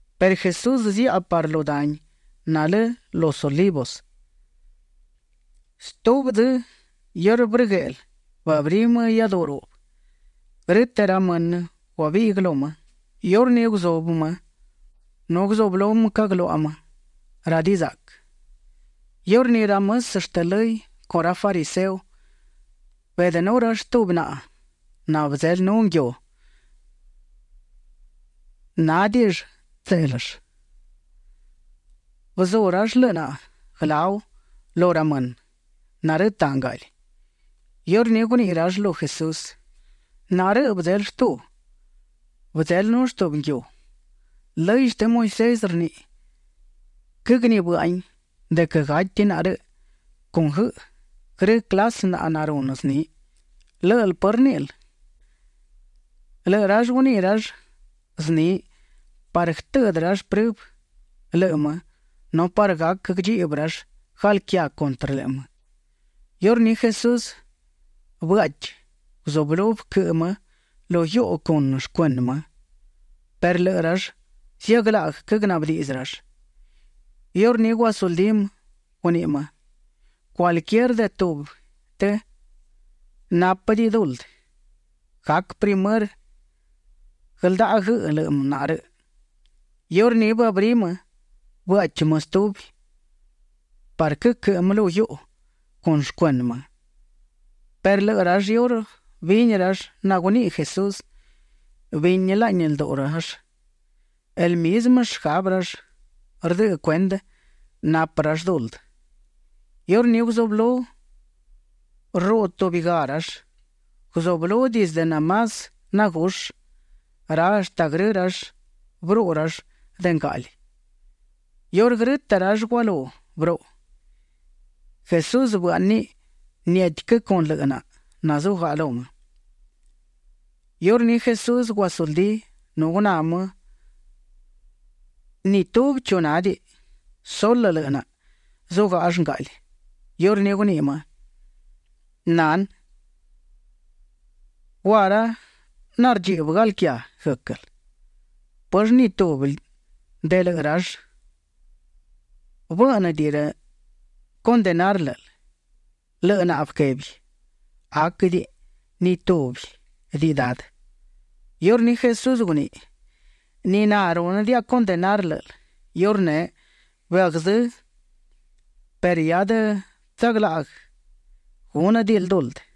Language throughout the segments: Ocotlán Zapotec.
Perë Jesús ziaꞌa parë lu dani nalë los Olivos. Stubi dzë iurë brëgueꞌlë, bëabrí më iáduꞌu ruꞌbë. Grë́tëꞌ ra mënë guabiꞌguë lu më. Iurní guzubë më nu guzublú cagluaꞌa më ra dizaꞌquë. Iurní ra mësë shtë lëy con ra fariseo, beꞌdënú rall tubi naꞌa nabëdzelënú nguiu nanádiꞌi tséꞌlëll. Bëzú rall lëꞌë naꞌa guëláu lu ra mënë narëtaꞌ ngaꞌli. Iurní guniꞌi rall lu Jesús: ―Naꞌa rëꞌ bëdzelë shtu; bëdzelënull tubi nguiu. Lëy shtë Moisés rniꞌi; quëgnibë́ꞌahin de quë gati naꞌa rëꞌ con guëꞌë, grë clasë naꞌa narunë zni. ¿Lë́ꞌël pë rníꞌil? Lëꞌë rall guniꞌi rall zni parë guëtëꞌdë rall prëbë lëꞌë më nu parë gac guëdchiꞌbë rall galquiá cuntrë lëꞌë më. Iurní Jesús bëáꞌchiꞌ; guzublú guëquëꞌë më lu guiuꞌu con shcuënë më; perë lëꞌë rall ziaglaꞌguë quëgnaꞌbë diꞌdzë rall. Iurní guasuldí më; guniꞌi më: ―Cualquier de tubi lëꞌë të nanápëdiꞌi duldë, gac primërë guëldaꞌa guëꞌë lëꞌë naꞌa rëꞌ. Iurní bëabrí më bëaꞌchi më stubi parë guëquëꞌë më lu guiuꞌu con shcuënë më. Perë lëꞌë rall iurë bini naguniꞌi Jesús, bini laꞌni lduꞌu rall; el mizmë shgabë rall rdëꞌë cuendë napë rall duldë. Iurní guzublú rruꞌu tubigá rall. Guzublú dizdë de más nagushë ra hashtë grë rall bëruꞌu rall de ngaꞌli. Iurë grë́tëꞌ rall gualú bëruꞌu, Jesús bëáꞌniꞌ niétiquë con lëꞌë naꞌa nazugaꞌa lu më. Iurní Jesús guasuldí nu guná më ni tubi chu nádiꞌi. Sulë lëꞌë naꞌa zugáꞌall ngaꞌli. Iurní guniꞌi më: ―Nanë, ¿gua ra nardchiꞌbë galquiá guë́quël? ¿Pëllë ni tubi de lëꞌë rall bë́ꞌnëdiꞌi condenar lë́ꞌël? Lëꞌë naꞌa bëquebi: ―Aquëdiꞌi, ni túbidiꞌi, Dadë. Iurní Jesús guniꞌi: ―Ni na rúnëdiaꞌa condenar lë́ꞌël. Iurneꞌ bëagzë́ perë hia adë tsaglaꞌguë gúnëdiꞌil duldë.]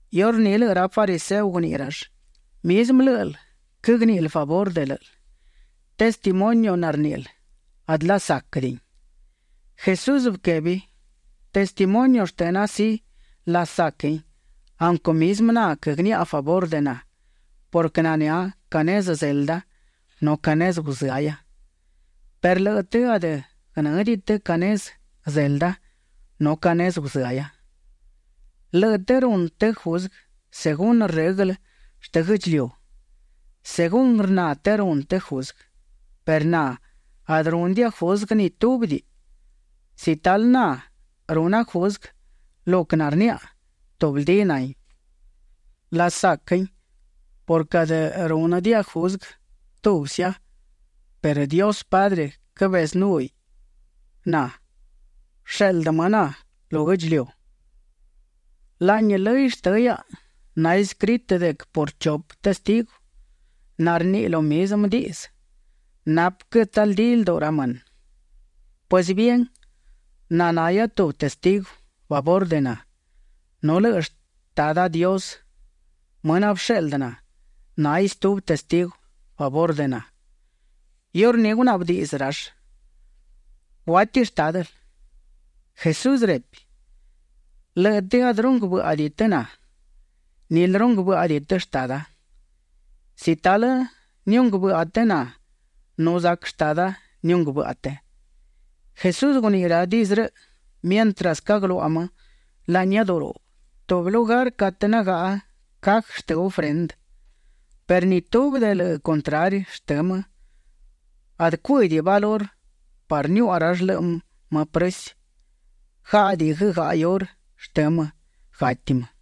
Iurní lëꞌë ra fariseo guniꞌi rall: ―Mizmë lë́ꞌël quëgníꞌil favurë de lë́ꞌël. Testimonio narníꞌil adë lasáquëdiꞌin. Jesús bëquebi: ―Testimonio shtëna, sí, lasaquin aunquë mizmë na quëgniaꞌa favurë de na purquë nanë́a ca nezë zelda nu ca nezë guzëahia; perë lëꞌë të adë guënë́diꞌi të ca nezë zelda nu ca nezë guzëahia. Lëꞌë të runë të juzguë según rëglë shtë guë́ꞌdchiliu; según rna të runë të juzguë, perë na adë rúnëdiaꞌa juzguë ni túbidiꞌi. Si talë na runa juzguë, lo quë narniaꞌa, tubldí nahin; lasaquin purquë adë rúnëdiaꞌa juzguë tubsia perë Dios Padre quëbezënúhiꞌ na; bësheꞌldë më na lu guë́ꞌdchiliu. Laꞌni lëy shtë hiaꞌa naescritë de quë por chupë testigu narniꞌi lo mizmë diꞌdzë, napë quë tsaldí lduꞌu ra mënë. Pues bien, na nahia tubi testigu favurë de na, nu lëꞌë Shtada Dios, më nabësheꞌldë na, náhiꞌ stubi testigu favurë de na. Iurní gunaꞌbë diꞌdzë rall: ―¿Guátiꞌi shtádël? Jesús repi: ―Lëꞌë të adë runguë bë́ꞌadiꞌi të na, nilë runguë bë́ꞌadiꞌi të Shtada. Si talë niunguë bëꞌa të na nu zac Shtada niunguë bëꞌa të. Jesús guniꞌi ra diꞌdzë rëꞌ mientras quëgluaꞌa më laꞌni iáduꞌu ruꞌbë, tubi lugar catë nagaꞌa cajë shtë ofrendë; perë ni tubi de lëꞌë contrari shtë më, adë cuë́diꞌi valurë parë niuaꞌa rall lëꞌë më prësi. Gáꞌadiꞌi guëgaꞌa iurë shtë më, gati më.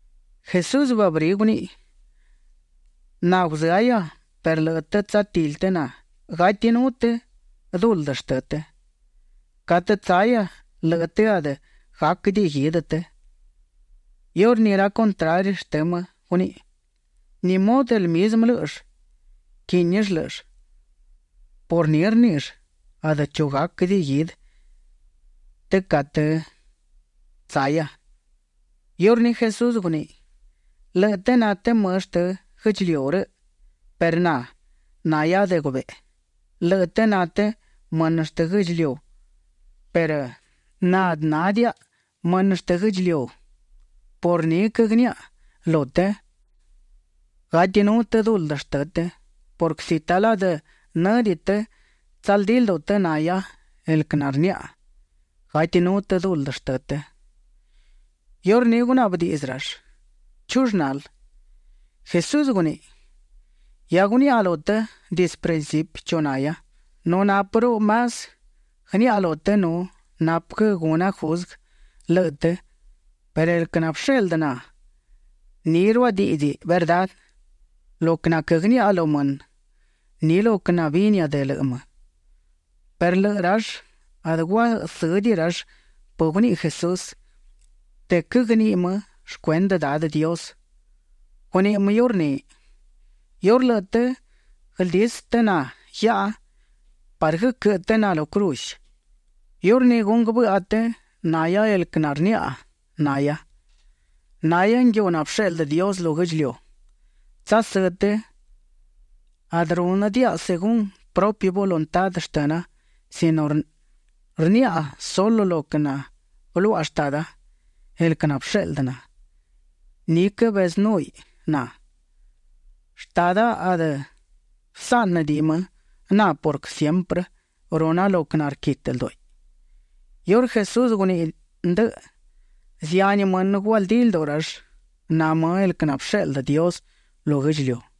Jesús bëabrí guníꞌiꞌ: ―Na guzëahia perë lëꞌë të tsatili të na. Gatinú të duldë shtë të. Catë tsahia lëꞌë të adë gáquëdiꞌi guidë të. Iurní ra contrari shtë më guniꞌi: ―¿Ni mudë el mizmë lë́ꞌëll quínill lë́ꞌëll? por ni rníꞌill: “Adë chu gáquëdiꞌi guidë të catë tsahia”. Iurní Jesús guniꞌi: ―Lëꞌë të na të mënë shtë guë́ꞌdchiliu rëꞌ perë na, nahia de gubeꞌe. Lëꞌë të na të mënë shtë guë́ꞌdchiliu perë na adë nádiaꞌa mënë shtë guë́ꞌdchiliu. Por ni quëgniaꞌa lu të, gatinú të duldë shtë të purquë si talë adë në́diꞌi të tsaldí lduꞌu të nahia el quë narniaꞌa, gatinú të duldë shtë të. Iurní gunaꞌbë diꞌdzë rall: ―¿Chull nal? Jesús guniꞌi: ―Hia guniaꞌa lu të dizdë principi chu nahia nu nápëruꞌu más guëniaꞌa lu të nu napë quë guna juzguë lëꞌë të, perë el quë nabësheꞌldë na, ni ruadíꞌdziꞌ verdá. Lo quë naquëgniaꞌa lu mënë, ni lo quë nabinia de lëꞌë më. Perë lëꞌë rall adë guasë́diꞌi rall pë guniꞌi Jesús, de quë quëgniꞌi më shcuendë Dadë Dios. Guniꞌi më iurní: ―Iurë lëꞌë të guëldisë të na guiaꞌa parë guëquëꞌë të na lu cruz, iurní gunguë bëꞌa të nahia el quë narniaꞌa nahia. Nahia nguiu nabësheꞌldë Dios lu guë́ꞌdchiliu. Tsasë́ të adë rúnëdiaꞌa según prupi voluntá shtëna sino rniaꞌa sulë lo quë nabëluaꞌa Shtada. El quë nabësheꞌldë na, ni quëbezënúhiꞌ na. Shtada adë bësáꞌnëdiꞌi më na purquë siemprë runa lo quë narquitë ldúꞌiꞌ. Iurë Jesús guniꞌi ndëꞌë, zihani mënë gualdí lduꞌu rall na më el quë nabësheꞌldë Dios lu guë́ꞌdchiliu.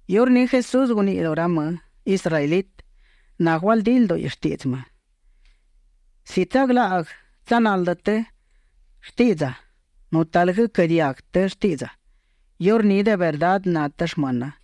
Iurní Jesús guniꞌi lu ra më israelitë nagualdí lduꞌi shtiꞌdzë më: ―Si tsaglaꞌguë tsanaldë të shtiꞌdza nu talë guëquë́ diaguë të shtiꞌdza, iurní de verdá na të shmëna.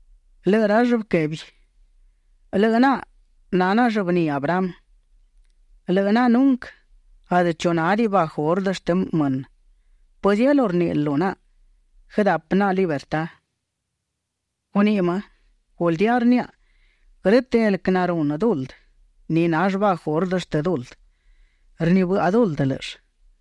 Lëꞌë rall bëquebi: ―Lëꞌë naꞌa na naꞌa llëbní Abraham. Lëꞌë naꞌa nunquë adë chu nádiꞌi bajo ordë shtë mënë. ¿Pëzielú rníꞌil lu naꞌa guëdapë naꞌa libertá? Guniꞌi më: ―Guldía rniaꞌa, grë́tëꞌ el quë narunë duldë, ni nall bajo ordë shtë duldë; rnibëꞌa duldë lë́ꞌëll.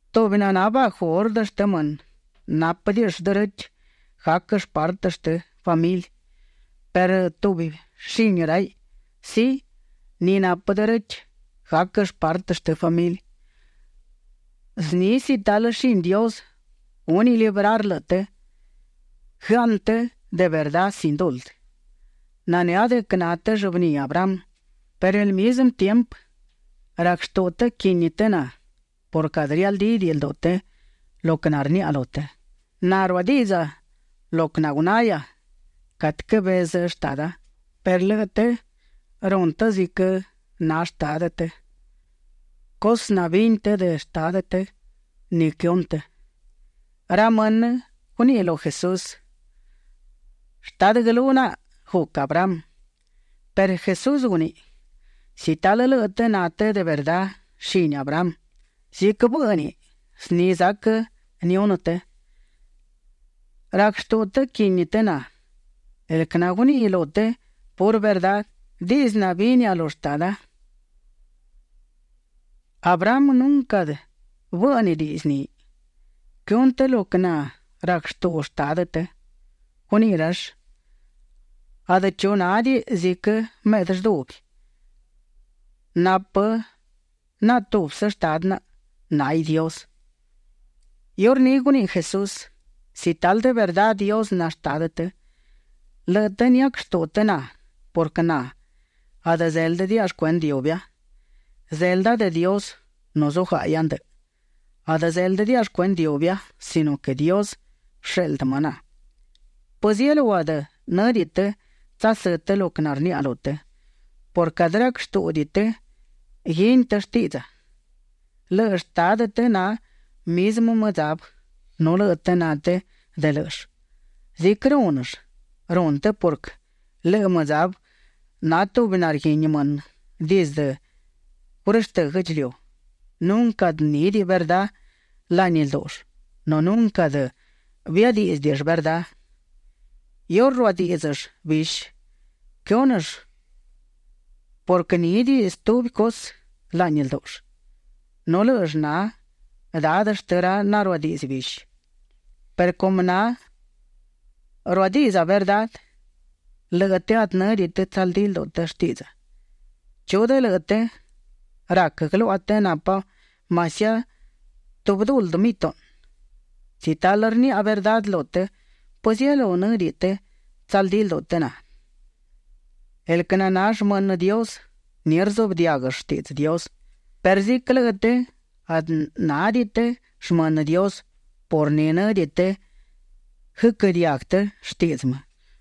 Tubi naná bajo ordë shtë mënë, nápëdiꞌill derechë gáquëll partë shtë famili perë tubi shini raiꞌ, sí, ni napë derechë gáquëll partë shtë famili. Zni si talë shini Dios gúniꞌ librar lëꞌë të, guëaꞌnë të de verdá sin duldë. Nanë́a de quë na të llëbní Abraham, perë el mizmë tiempë rac shtuꞌu të quini të na purquë adë rialdídiꞌi lduꞌu të lo quë narniaꞌa lu të. Na ruadiꞌdza lo quë nagunahia catë cabezë Shtada, perë lëꞌë të runë të ziquë na shtadë të; cusë nabini të de shtadë të, ni quëhunë të. Ra mënë guniꞌi lu Jesús: ―Shtadë guëlú naꞌa guc Abraham. Perë Jesús guniꞌi: ―Si talë lëꞌë të na të de verdá shini Abraham, ziquë bë́ꞌniꞌ, zni zac nihunë të. Rac shtuꞌu të quini të na, el quë naguniꞌi lu të purë verdá, diꞌdzë nabinia lu Shtada. Abraham nunquë bë́ꞌnëdiꞌiꞌ zniꞌi. Quëhunë të lo quë narac shtuꞌu shtadë të. Guniꞌi rall: ―Adë chu nádiꞌi ziquë meꞌdë lldubi. Napë naꞌa tubsë Shtadë naꞌa; náhiꞌ Dios. Iurní guniꞌi Jesús: ―Si talë de verdá Dios na Shtadë të, lëꞌë të niac shtuꞌu të na purquë na adë zéldëdiaꞌa shcuendë iubia; zelda de Dios nu zugáꞌahia ndëꞌë. Adë zéldëdiaꞌa shcuendë iubia sino quë Dios bësheꞌldë më na. ¿Pëzielú adë në́diꞌi të tsasë́ të lo quë narniaꞌa lu të? purquë adë rac shtúꞌudiꞌi të guini të shtiꞌdza. Lëꞌë shtadë të na mizmë mëdzabë nu lëꞌë të na të de lë́ꞌëll. Ziquë rúnëll, runë të purquë lëꞌë mëdzabë na tubi narguini mënë dizdë gurështë́ guë́ꞌdchiliu. Nunquë adë nídiꞌi verdá laꞌni ldúꞌull nu nunquë adë biadíꞌdzëdiꞌill verdá. Iurë ruadíꞌdzëll, bishi quëhúnëll purquë nídiꞌi stubi cusë laꞌni ldúꞌull. Nu lë́ꞌëll na dadë shtë ra naruadiꞌdzë bishi. Perë cumë na ruadiꞌdza verdá, lëꞌë të adë në́diꞌi të tsaldí lduꞌu të shtiꞌdza. ¿Chu de lëꞌë të rac guëluaꞌa të napa masiá tubi duldë mituꞌnë? Si talë rniaꞌa verdá lu të, ¿pëzielú në́diꞌi të tsaldí lduꞌu të na? El quë na shmënë Dios, ni rzuꞌbë diáguëll shtiꞌdzë Dios; perë ziquë lëꞌë të adë nádiꞌi të shmënë Dios, por ni në́diꞌi të guëquë́ diaguë të shtiꞌdzë më.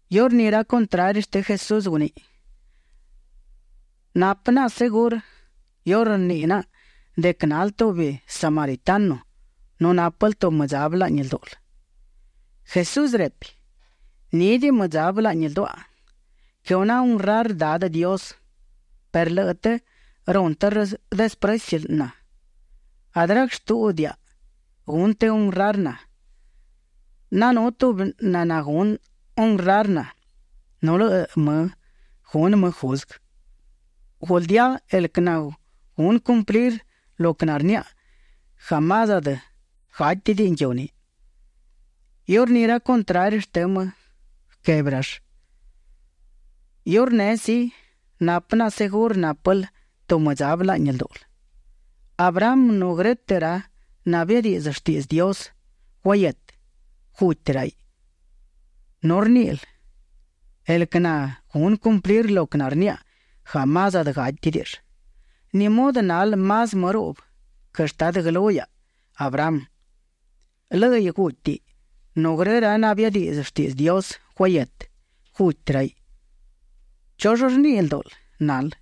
Iurní ra contrari shtë Jesús guniꞌi: ―Napë naꞌa segurë iurë rniꞌi naꞌa de quë nal tubi samaritano nu nápël tubi mëdzabë laꞌni ldúꞌul. Jesús repi: ―Nídiꞌi mëdzabë laꞌni lduaꞌa. Quëhuna honrar Dadë Dios, perë lëꞌë të runë të desprëci na. Adë rac shtúꞌudiaꞌa gunë të honrar na; nanú tubi naná gunë honrar na, nu lëꞌë më gunë më juzguë. Guldía, el quë nagunë cumplir lo quë narniaꞌa, jamás adë gátidiꞌi nguiu ni. Iurní ra contrari shtë më bëquebi rall: ―Iurneꞌ sí, napë naꞌa segurë nápël tubi mëdzabë laꞌni ldúꞌul. Abraham nu grë́tëꞌ ra nabiadiꞌdzë shtiꞌdzë Dios guahietë, guti raiꞌ, nu rníꞌil: “El quë nagunë cumplir lo quë narniaꞌa, jamás adë gátidiꞌill”. ¿Ni mudë nal más më ruꞌbë quë shtadë guëlú hiaꞌa Abraham? Lë́ꞌiꞌ gútiꞌ nu grë ra nabiadiꞌdzë shtiꞌdzë Dios guahietë, guti raiꞌ. ¿Chull rniꞌi ldúꞌul nal?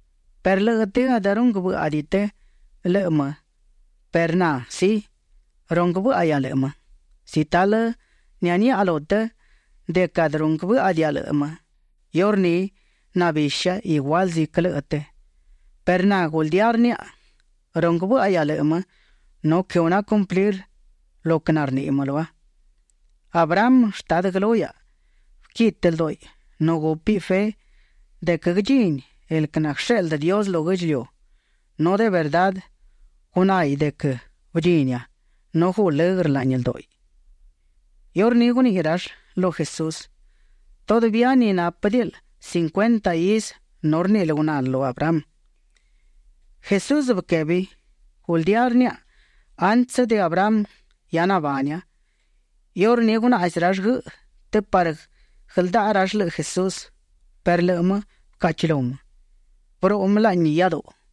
Perë lëꞌë të adë runguë bë́ꞌadiꞌi të lëꞌë më perë na, sí, runguë bë́ꞌahia lëꞌë më. Si talë nianiaꞌa lu të de quë adë runguë bë́ꞌadiaꞌa lëꞌë më, iurní nabisha igual ziquë lëꞌë të. Perë na guldía rniaꞌa, runguë bë́ꞌahia lëꞌë më nu quëhuna cumplir lo quë narniꞌi më lua. Abraham, shtadë guëlú hiaꞌa, bëquitë ldúꞌiꞌ nu gúpiꞌ fe de quë guëdchini el quë naguësheꞌldë Dios lu guë́ꞌdchiliu. Nu de verdá gunáhiꞌ de quë bëdchinia nu guꞌ lëgrë laꞌni ldúꞌiꞌ. Iurní guniꞌi rall lu Jesús: ―Todavía ni nápëdiꞌil cincuenta izë nu rníꞌil gunal lu Abraham. Jesús bëquebi: ―Guldía rniaꞌa, antsë de Abraham hia nabania. Iurní gunaꞌzi rall guëꞌë të parë guëldaꞌa rall lëꞌë Jesús perë lëꞌë më bëcaꞌchilú më. Bëruꞌu më laꞌni iáduꞌu.